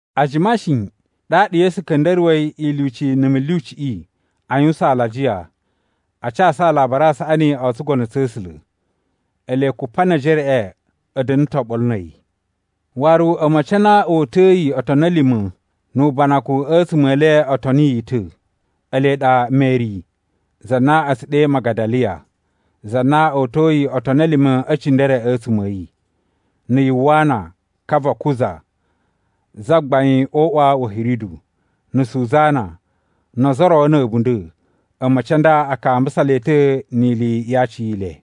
A jima shi, ɗaɗa Yesu ka̱nda̱ruwa̱i ilyuci na̱ mulyuciꞌi a yuwusan alajiya, a casu Alabari a Saꞌani o tsugono tsa̱ A̱sula̱. Ele Kupanejereꞌe a̱ da̱na̱ ta̱ oɓolo na̱ a̱yi. Waru a̱ma̱ci a na o uta̱yi otoni a̱ lima̱ nu ubanakun a̱tsuma̱ e le o toni yi ta̱. Ele ɗa Meri, za na a̱ tsu ɗe Magadaliya, za na o uta̱yi otoni a̱ lima̱ e cindere a̱tsuma̱ a̱ yi, na̱ Yuwana ka va Kuza (zagbain o uꞌwa wa̱ Hiridu), na̱ Suzana, no ozo o ro na̱ a̱bunda̱. A̱ma̱ci a nda a kambusa le ta̱ ni ili ya aciyele.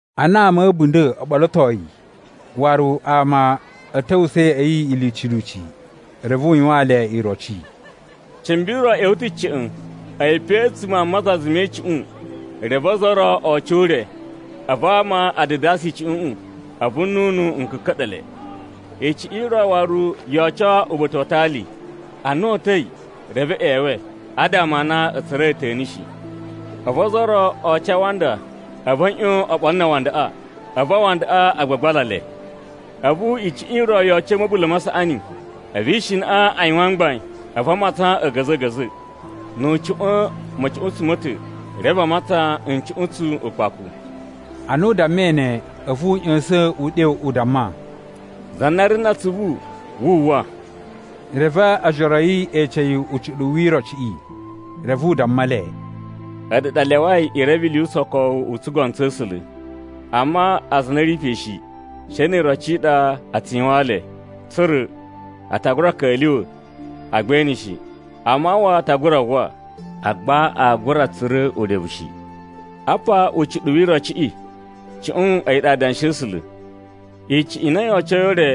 Ana ama a̱ a̱bunda̱ o ɓolotoi, waru ama a̱ ta̱wusa̱ ya̱ꞌa̱ yi lyuci lyuci, reve u yuwaan le iroci: “Cimbi ro ꞌya̱wa̱ ta̱ ca̱ꞌa̱n. A̱yi pe a̱tsuma̱ a mazaza me icuꞌun, reve ozo o ro o oco o ure. A̱vu ama a dadasa icuꞌuꞌun, a̱vu nnunu n ka̱ka̱ɗa̱ le. Icuꞌun i ro waru yo oco uba̱ta̱ wa atali. Ana o uta̱i, reve e ꞌyewe adama a na a̱ tsura̱i a̱ta̱ni shi. A̱vu ozo o ro o oco a awanda, a̱vu a̱ ꞌyon oɓolo na awandaꞌa, a̱vu awandaꞌa a gbagbala le. A̱vu icuꞌun i ro yo oco a̱ ma̱bula̱ ma saꞌani, a̱vu ishinaꞌa a yuwan mgbain, a̱vu a matsan a̱ga̱za̱ a̱ga̱za̱. Nu u cuꞌwa̱n ma̱cuꞌuntsu ma̱ ta̱, reve a matsan ncuꞌuntsu ukpaku.” Ana u dammai ne, a̱vu u ꞌya̱sa̱n uɗyo u damma, “Za na ri na atsuvu, wu uwwa.” Reve ojoro a̱ yi e ece yi ucuɗuwu wi irociꞌi. Reve u damma le, “A̱ɗu ɗa a lyawai i reve ili yu usokowu u tsugono tsa̱ A̱sula̱. Amma aza a na a̱ ri pe shi, she ni iroci i ɗa a tsu yuwaan le tsa̱ra̱: ‘A ta gura ka̱lyuwa̱, agba e ene shi. A mawwa a ta gura uwwa, agba aa gura tsura̱ urevu shi.’ “Apa ucuɗuwu wi irociꞌi: Cuꞌun a̱yi ɗa adanshi a̱ A̱sula̱. Icuꞌun i na yo ocoi o ure,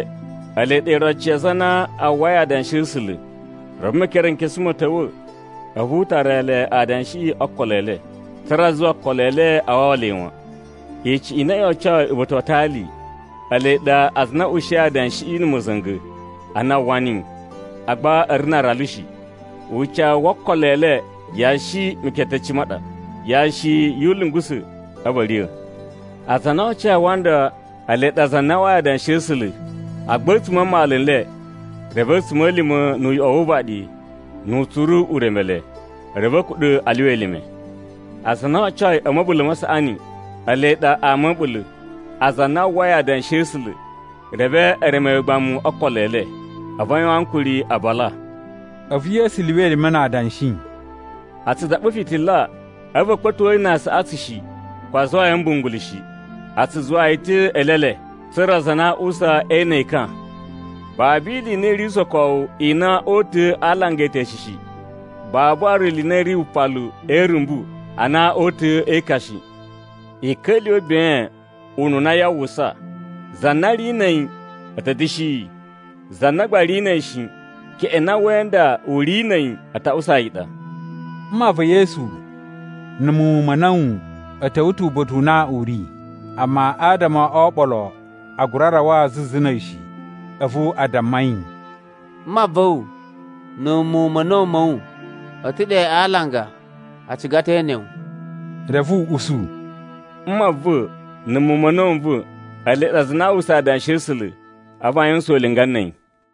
ele ɗa iroci ya aza a na a uwwai adanshi a̱ A̱sula̱. Reve Mekerenkesu ma̱ ta̱wa̱, a̱vu u tara le adanshiꞌi o okolo e le, tsa̱ra̱ a zuwa okolo e le a wawa le wan. Icuꞌun i na yo ocoi uba̱ta̱ wa atali, ele ɗa aza a na a̱ ushiyi adanshiꞌi na̱ ma̱za̱nga̱ ana a uwwa niyi, agba a̱ ri na aralu shi. Ucawu wo okolo e le yashi meketeci ma ɗa, yashi yu ulyungusa̱, a̱vu a̱ riya̱. Aza a na o ocoi a awanda, ele ɗa aza a na a uwwai adanshi a̱ A̱sula̱, agba a̱tsuma̱ a mmalu n le, reve a̱tsuma̱lima̱, nu uyoꞌo wu uvaɗi, nu utsuru u reme le, reve a̱ kuɗa̱ a lyuwa elime. Aza a na o ocoi a̱ ma̱bula̱ ma saꞌani, ele ɗa ama a̱ a̱ɓula̱, aza a na a uwwai adanshi a̱ A̱sula̱, reve e reme yi ugbamu o okolo e le, a̱vu a yuwan ankuri a bala.” A̱vu Yesu lyuwa elime na adanshi, “A tsu daɓa fitila, a̱vu a̱ kpa̱to yi na aasaꞌatsu shi, ko a zuwa yi a̱ mbungulu shi. A tsu zuwa yi ta̱ e eelele, tsa̱ra̱ aza a na a uwusa e ene ekan. Babu ili i na i ri usokowu i na oo uta̱a̱ a alanga e eteshe shi. Babu waru ili i na i ri wupalu e irumbu ana oo uta̱a̱ e ekan shi. I ka̱lyuwa̱ ben ununa yaa uwwusa. Za na ri na̱ a̱yi a̱ ta̱ da̱shi yi, za na gba ri na̱ a̱yi shi, keꞌen na we inda u ri na̱ a̱yi a̱ ta̱ ushi yi i ɗa.” Mma va̱ Yesu na̱ muwun ma̱ a̱na̱wu a̱ ta̱wa̱ ta̱ uba̱ta̱ u na u ri, amma adama o oɓolo a gura rawa zuzu na̱ a̱yi shi. A̱vu a damma yi, “Mma va̱ wu na̱ muwun ma̱ a̱na̱wu ma̱ wu a̱ ta̱ ɗe a alanga, a ciga ta̱ e ene wu.” Reve u usu, “Mma va̱ na̱ muwun ma̱ a̱na̱wu n va̱, ele ɗa aza a na a uwwusa adanshi a̱ A̱sula̱, a̱vu a yuwusan ulinga na̱ a̱yi.”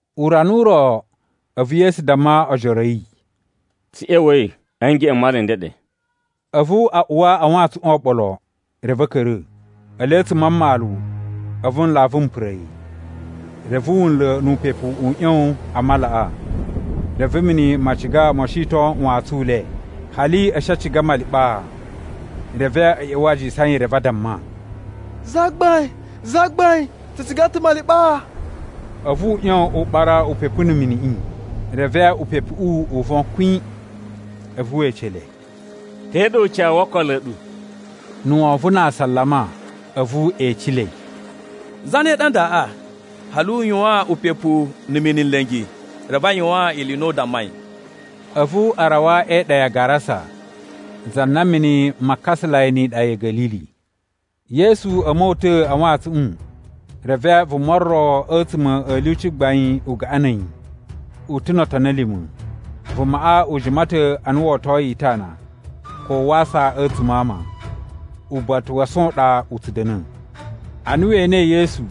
Urana u ro, a̱vu Yesu damma ojoro a̱ yi, “Tsu ꞌya̱wa̱i a̱ ngeꞌen m mala n ndeɗe.” A̱vu a uwa a wantsuꞌun oɓolo, reve a̱ ka̱ra̱. Ele a̱tsuma̱ a mmalu, a̱vu nlavu m pura̱ yi. Reve wunla̱ nu upepu u ꞌyon a malaꞌa, reve mini ma ciga mo shiton wantsun u le, hali a̱ shi a ciga maliɓaa. Reve a̱ ꞌya̱wa̱ a jisan yi, reve a damma, “Zagbain, zagbain, tsu ciga ta̱ maliɓaa!” A̱vu u ꞌyon u ɓara upepu na̱ miniꞌi, reve upepuꞌu u von kwin. A̱vu we ece le, “Te ɗa ucawu wo okolo a̱ ɗu?” Na̱ wovon na asalama, a̱vu e ecelei, “Zane ɗa ndaꞌa? Hali u yuwaan upepu na̱ mini nla̱ngi, reve a yuwan ili i na u dammai!” A̱vu a rawa e iɗa ya Garasa, za na mini ma kasalai ni iɗa ya̱ Ga̱lili. Yesu a̱ mota̱a̱ a wantsuꞌun, reve vuma ro a̱tsuma̱ a̱ lyuci gbain u gaꞌan na̱ a̱yi, u ta̱ no otoni a̱ lima̱. Vumaꞌa u jima ta̱ ana wo otoyi itana, ko wa asa a̱tsuma̱ a ama. Uba̱ta̱ wa ason u ɗa u tsu da̱na̱. Ana we enei Yesu,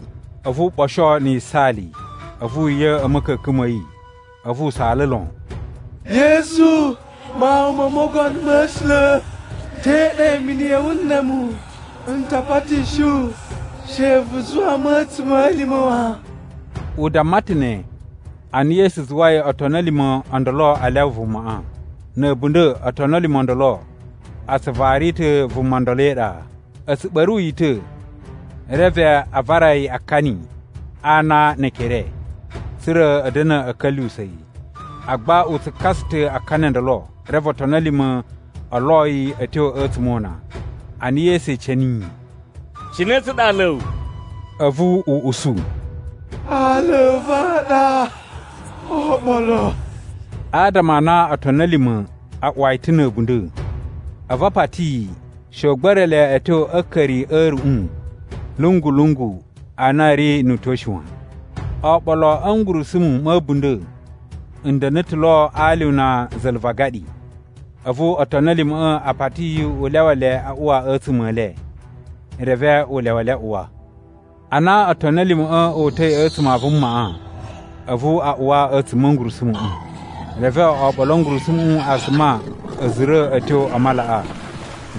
a̱vu u ɓosho na̱ yisaali, a̱vu u riya̱ a̱ ma̱ka̱ka̱n ma̱ yi, a̱vu u saala lon, “Yesu, Mawun mo Mogono ma̱ A̱sula̱, te ɗa imini ya̱ wu na̱ a̱mu, n ta patishi wu she vu zuwa mu a̱ a̱tsuma̱lima̱ wan!” U damma ta̱ ne, ana Yesu zuwai otoni a̱ lima̱ o ndolo a lyawa vumaꞌa. Na̱ a̱bunda̱ otoni a̱ lima̱ o ndolo a tsu vari ta̱ vuma ndolo e iɗa. A̱ tsu ɓa̱ru yi ta̱, reve a vara yi akani a ana ne ekere, tsa̱ra̱ a̱ da̱na̱ a̱ ka̱lyuwusa̱ yi. Agba u tsu kasa ta̱ akani o ndolo, reve otoni a̱ lima̱ o lo yi a̱ tyo a̱tsuma̱ o una. Ana Yesu ece niyi, “Cine tsa ɗa aala a̱ wu?” A̱vu u usu, “Aala a̱ va̱ a ɗa Oɓolo,” adama a na otoni a̱ lima̱ a uwa yi ta̱ na̱ a̱bunda̱. A̱vu a pati yi, she u gba̱ra̱ le a̱ tyo a̱ a̱a̱ka̱ri a̱ a̱ruꞌun lungu-lungu a na a̱ ri nu utyo shi wan. Oɓolo a̱ ngurusumu ma̱ a̱bunda̱ n da̱na̱ ta̱ lo a alyuna za̱la̱ va agaɗi. A̱vu otoni a̱ lima̱ꞌa̱ a pati yi u lyawa le a uwa a̱tsuma̱ e le, reve u lyawa le a uwa. Ana otoni a̱ lima̱ꞌa̱ o uta̱i a̱tsuma̱ a vumaꞌa, a̱vu a uwa a̱tsuma̱ a̱ ngurusumuꞌu. Reve oɓolo a̱ ngurusumuꞌu a suma a̱ zura̱ a̱ tyo a malaꞌa,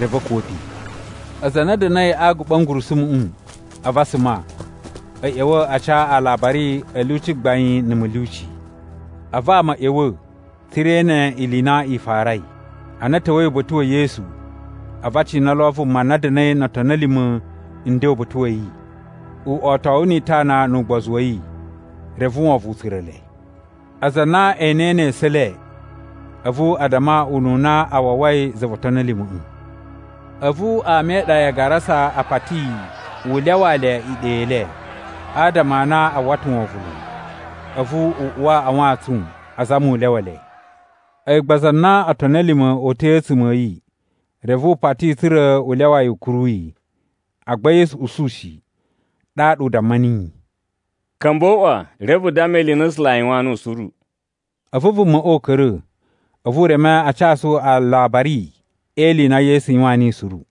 reve a̱ kuwa̱ pe. Aza a na a̱ da̱na̱i a aguɓa a̱ ngurusumuꞌu, a̱vu a suma, a̱ ꞌya̱wa̱ a ca alabari a̱ lyuci gbain na̱ mulyuci. A̱vu ama a̱ ꞌya̱wa̱, tsa̱ra̱ e ene ili i na i farai. Ana a̱ ta̱wa̱i uba̱ta̱ wa̱ Yesu, a̱vu a cina lo vuma na da̱na̱i no otoni a̱ lima̱ nden uba̱ta̱ wa̱ yi, uꞌotowu ni itana nu ugbozu wa̱ yi. Reve wovon u tsura̱ le. Aza a na e enei ne esu e le, a̱vu a damma ununa a wawai za vo otoni a̱ lima̱ꞌa̱. A̱vu ama e iɗa ya Garasa a pati yi u lyawaa le iɗa i le, adama a na a uwwa ta̱ wovon lon. A̱vu u uwa a wantsun, azama u lyawa le. A̱yi gba za na otoni a̱ lima̱ o uta̱i a̱tsuma̱ a̱ yi, reve u pati tsa̱ra̱ u lyawa yi u kuru yi. Agba Yesu usu shi, ɗaɗa u damma niyi, “Ka̱mba̱ o uꞌwa, reve vu damma ili i na A̱sula̱ a yuwaan nuwu suru.” A̱vu vumaꞌa u ka̱ra̱, a̱vu u reme a casu aalabari e ili i na Yesu yuwaan niyi suru.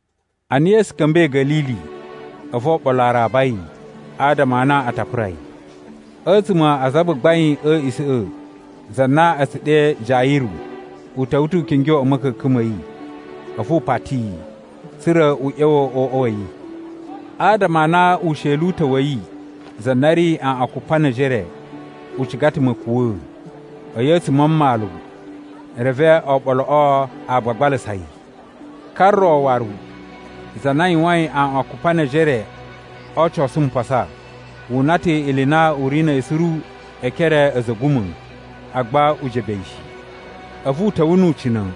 Ana Yesu ka̱mba̱i Ga̱lili, a̱vu oɓolo a raba yi, adama a na a ta pura yi. A̱tsuma̱ a azagbagbain a̱ a̱a̱ꞌisa̱ꞌa̱, za na a̱ tsu ɗe Jayiru, u ta̱wa̱ ta̱ u kingyo a̱ ma̱ka̱ka̱n ma̱ yi, a̱vu u pati yi, tsa̱ra̱ u ꞌya̱wa̱ o uꞌwa wa̱ yi. Adama a na usheli u ta̱ wa̱ yi, za na ri aꞌwan kupa ne ejere, u ciga ta̱ ma̱kuwa̱a̱. A̱yi a̱tsuma̱ a mmalu, reve oɓoloꞌo a gbagbalasa yi. Ka ro waru, za na yuwain aꞌwan kupa ne ejere o ocosu mpasa, [wu una ta̱ ili i na u ri na̱ yi suru e ekere a̱ a̱za̱ a̱ a̱guma̱,] agba u jebe yi shi. A̱vu u ta̱wa̱ nu ucina̱,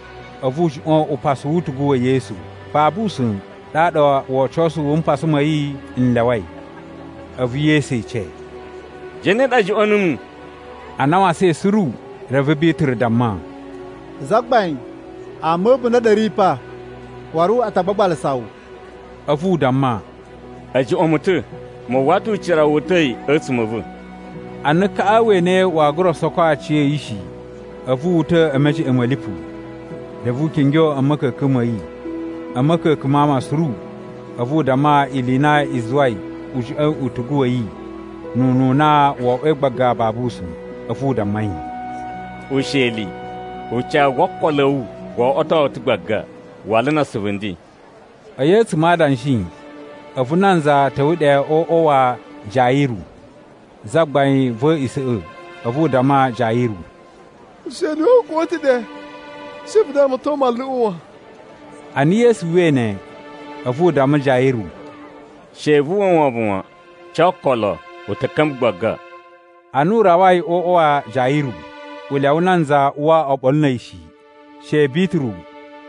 a̱vu u juꞌwa̱n upasu wu utugu wa̱ Yesu. Babu usa̱n, ɗaɗa wocosu wu mpasa ma̱ yi n lyawai. A̱vu Yesu ece, “Zane ɗa juꞌwa̱n numu?” Ana a wasain suru, reve Bituru damma, “Zagbain, ama a̱ a̱bunda̱ a ɗa a̱ ri pa, waru a ta gbagbalasa wu.” A̱vu u damma, “A̱ juꞌwa̱n mu ta̱. Mu uwwa ta̱ ucira wu uta̱i a̱tsuma̱ a̱ va̱.” Ana kaꞌa we enei waa gura soko aciya̱yi shi, a̱vu wu uta̱ e mejeꞌen ma̱ lipu, reve u kingyo a̱ ma̱ka̱ka̱n ma̱ yi. A̱ ma̱ka̱ka̱n ma ama suru, a̱vu u damma ili i na i zuwai u juꞌwa̱in utugu wa̱ yi nu ununa wo oꞌwoi gbaga babu usa̱n. A̱vu u damma yi, “Usheli, ucawu wo okolo a̱ wu wo oꞌwoto wu ta̱ gbaga. Wala na asuvu nden.” A̱yi a̱tsuma̱ a adanshi, a̱vu nanza ta̱wa̱ ɗe o uꞌwa wa Jayiru, zagbain va̱ a̱a̱ꞌisa̱ꞌa̱, a̱vu u damma Jayiru, “Usheli wa̱ wu u kuwa̱ ta̱ ɗe. She vu damaton manluꞌu wan.” Ana Yesu uwwai ne, a̱vu u damma Jayiru, “She vu uwwa wovon wan. Ca okolo, u ta̱ ka̱mba̱ gbaga.” Ana u rawai o uꞌwa wa Jayiru, u lyawa nanza uwa oɓolo na̱ a̱yi shi, she Bituru,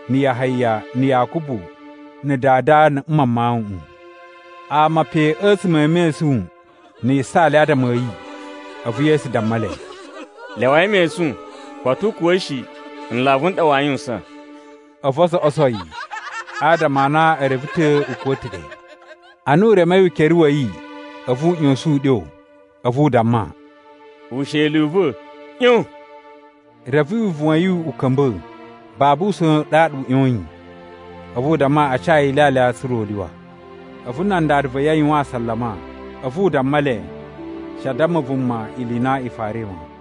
na̱ Yahaya, na̱ Yakubu, na̱ dada na̱ mma mawuꞌun. Ama pe a̱tsuma̱ a̱ mesun na̱ yisaali adama a̱ yi. A̱vu Yesu damma le, “Lyawai mesun. Koto u kuwa̱ shi. Nlavu n ɗa waa yuwusan.” A̱vu o zoꞌoso yi, adama a na e reve ta̱ u kuwa̱ ta̱ ɗe. Ana u remei ukere wa̱ yi, a̱vu u ꞌya̱sa̱n uɗyo, a̱vu u damma, “Usheli u va̱, ꞌyon!” Reve wivuwun wa̱ yi u ka̱mba̱, babu usa̱n ɗaɗa u ꞌyoyin. A̱vu u damma a ca yi ilyalya tsa̱ra̱ u lyuwa. A̱vu nan dada va̱ yi a yuwan asalama. A̱vu u damma le, she a damma vuma ili i na i farai wan.